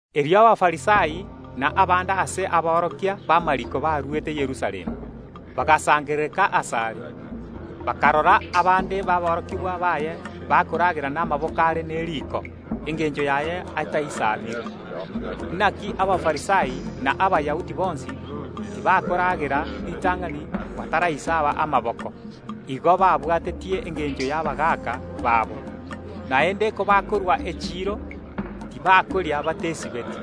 Erio Abafarisai na abande ase aborokia b’amariiko barwete Yerusalemu, bagasangererekana asare. Bakarora abande baborokigwa baye bakoragera namaboko are neriko, engencho yaye ataisabiri. (Inaki Abafarisai na Abayahudi bonsi tibakoragera ritang’ani bataraisaba amaboko. Igo babwatetie engencho y’abagaaka babo. Naende kobakorwa echiiro, tibakoria batesibetie.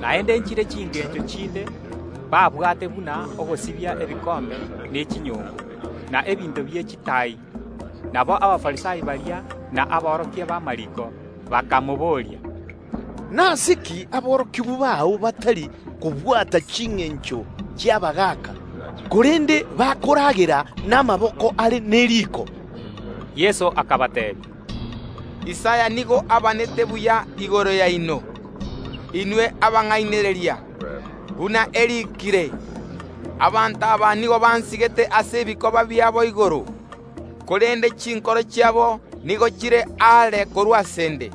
Naende nchire chingencho chinde babwate buna ogosibia ebikombe ne chinyongo, na ebinto bie chitaai.) Bono Abafarisai baria na aborokia b’amariiko bakabooria Yeso, “Nase ki aborokigwa bao batari kobwata chingencho chi’abagaaka, korende bakoragera namaboko are neriko?” Yeso akabateebia Isaya nigo abaanete buya igoro yaino, inwe abang’ainereria, buna eriikire; Abanto aba nigo bansigete ase ebikoba biabo igoro, korende chinkoro chiabo nigo chire aare korwa ase ’nde.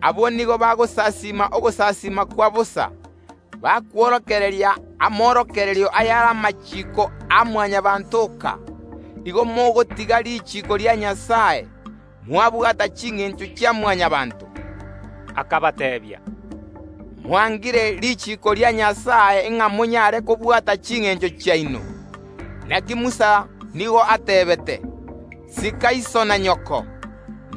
Abwo nigo bagonsasiima ogosasiima kwa bosa, bakworokereria amorokererio ayare amachiiko a Mwanyabaanto oka. Igo mogotiga richiiko ria Nyasae, mwabwata chingencho chia Mwanyabaanto. Yeso akagenderera kobateebia, “Mwangire richiiko ria Nyasae ng’a monyare kobwata chingencho chiaino. Inaki Musa nigo ateebete: Sika iso na nyoko,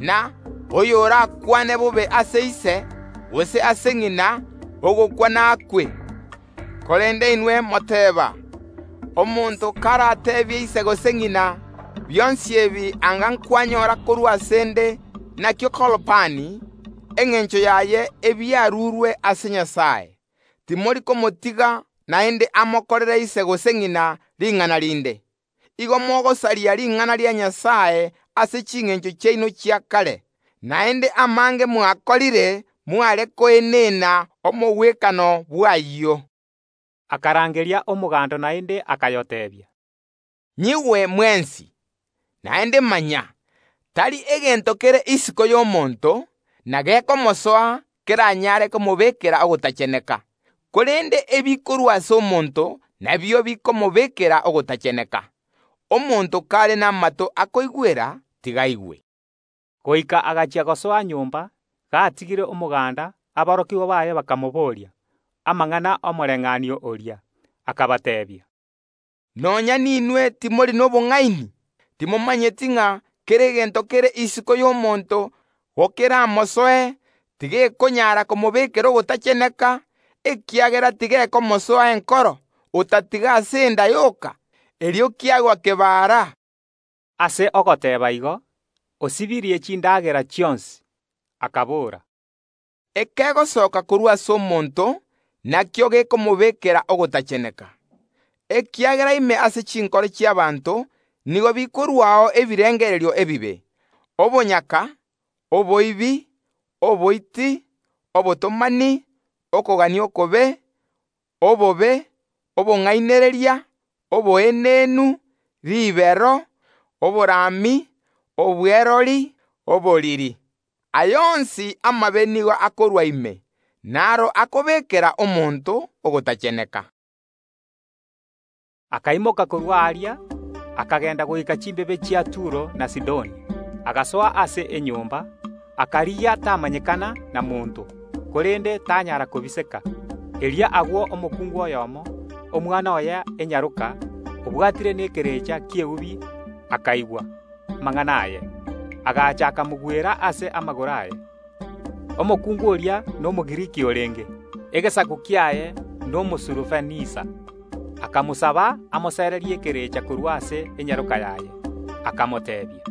na: Oyorakwane bobe ase ise, gose ase ng’ina, ogokwa nakwe. Korende inwe moteeba: Omonto karateebie ise gose ng’ina: Bionsi ebi anga kwanyora korwa ase ’nde nakio Korbani (engencho yaye: Ebiarurwe ase Nyasae) — timori komotiga naende amokorere ise gose ng’ina ring’ana rinde. Igo mogosaria ring’ana ria Nyasae ase chingencho chiaino chia kare. Naende amange mwakorire mware koenana omogwekano bw’ayio.” Erio Yeso akarangeria omoganda naende, akayoteebia, “Nyigwe mwensi, naende manya: Tari egento kere isiko y’omonto, na gekomosoa, keranyare komobekera ogotacheneka, korende ebikorwa ase omonto nabio bikomobekera ogotacheneka. [ Omonto kare namato akoigwera, tiga aigwe.]” Goika agachia gosoa nyomba, gatigire omoganda, aborokigwa baye bakamobooria amang’ana y’omobayeeno oria. Akabateebia, “Nonya ninwe timori nobong’aini? Timomanyeti ng’a kera egento kere isiko y’omonto gokeramosoe, tigekonyara komobekera ogotacheneka, ekiagera tigekomosoa enkoro, otatiga ase enda yoka, erio kiagwa kebara?” (Ase ogoteeba igo, osibirie chindagera chionsi.) Akabora “Ekegosoka korwa ase omonto nakio gekomobekera ogotacheneka. Ekiagera ime ase chinkoro chi’ abanto nigo bikorwao ebirengererio ebibe, obonyaka, oboibi, oboiti, obotomani, okogania okobe, obobe, obong’ainereria, oboenenu, ribero, oborami, obwerori, oboriri. Aya onsi amabe nigo akorwa ime, naro akobekera omonto ogotacheneka.” Yeso akaimoka korwa aria, akagenda goika omochie o Turo. Agasoa ase enyomba, akarigia tamanyekana na monto, korende tanyara kobiseka. Erio agwo omokungu oyomo, omwana oye enyaroka obwatire nekerecha ki’eubi, akaigwa amang’ana aye, agacha akamogwera ase amagoro aye. Omokungu oria n’Omogiriki orenge, egesaku kiaye n’Omosurofenisia. Akamosaba amosererie ekerecha korwa ase enyaroka yaye. Yeso akamoteebia,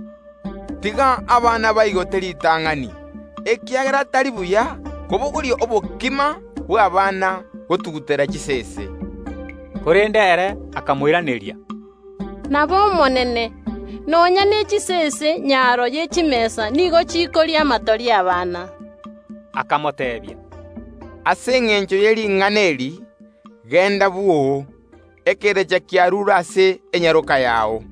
“Tiga abana baigote ritang’ani, ekiagera tari buya kobogoria endagera y’abana, gotugutera chisese.” Korende omokungu oria akamoiraneria, “Nab’Omonene, nonya nechisese nyaro ye chimesa nigo chikoria amatori y’abana.” Yeso akamoteebia, “Ase engencho ye ring’ana eri, genda bwoo, ekerecha kiarure ase enyaroka yao.”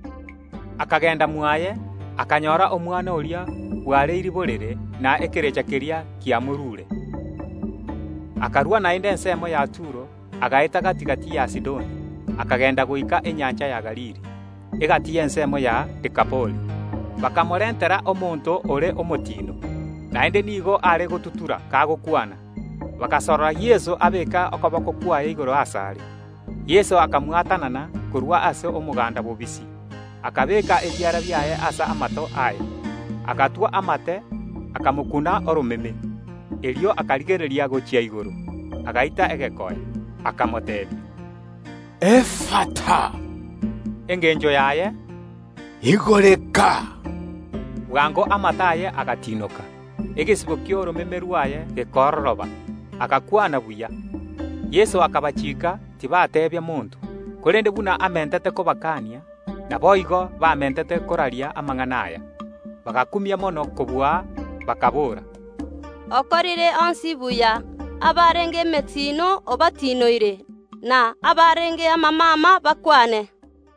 Akagenda mwaye, akanyora omwana oria bwareirie borere, na ekerecha keria kiamorure. Erio Yeso akarua agwo ase ensemo ya Turo, agaeta gati‐gati ya Sidoni, akagenda goika enyancha ya Galili, egati y’ensemo ya Dekapoli. Bakamorentera omonto ore omotiino, naende nigo are gotutura kagokwana; bagasorora Yeso abeeke okoboko kwaye igoro asare. Yeso akamwatanana korwa ase omoganda bobisi, akabeeka ebiara biaye ase amato aye, agatwa amate, akamokuna oromeme. Erio akarigereria gochia igoro, agaita egekoe, akamoteebia, “Efatha,” engencho yaye, “Igoreka.” Bwango amato aye agatiinoka, egesibo ki’oromeme rwaye gekororoba, agakwana buya. Yeso akabatianera tibateebia monto, korende buna amentete kobakania, naboigo bamentete koraria amang’ana aya. Abanto bagakumia mono kobua, bakaboora, “Okorire onsi buya. Abarenge emetiino obatiinoire, na abarenge amamama bakwane.”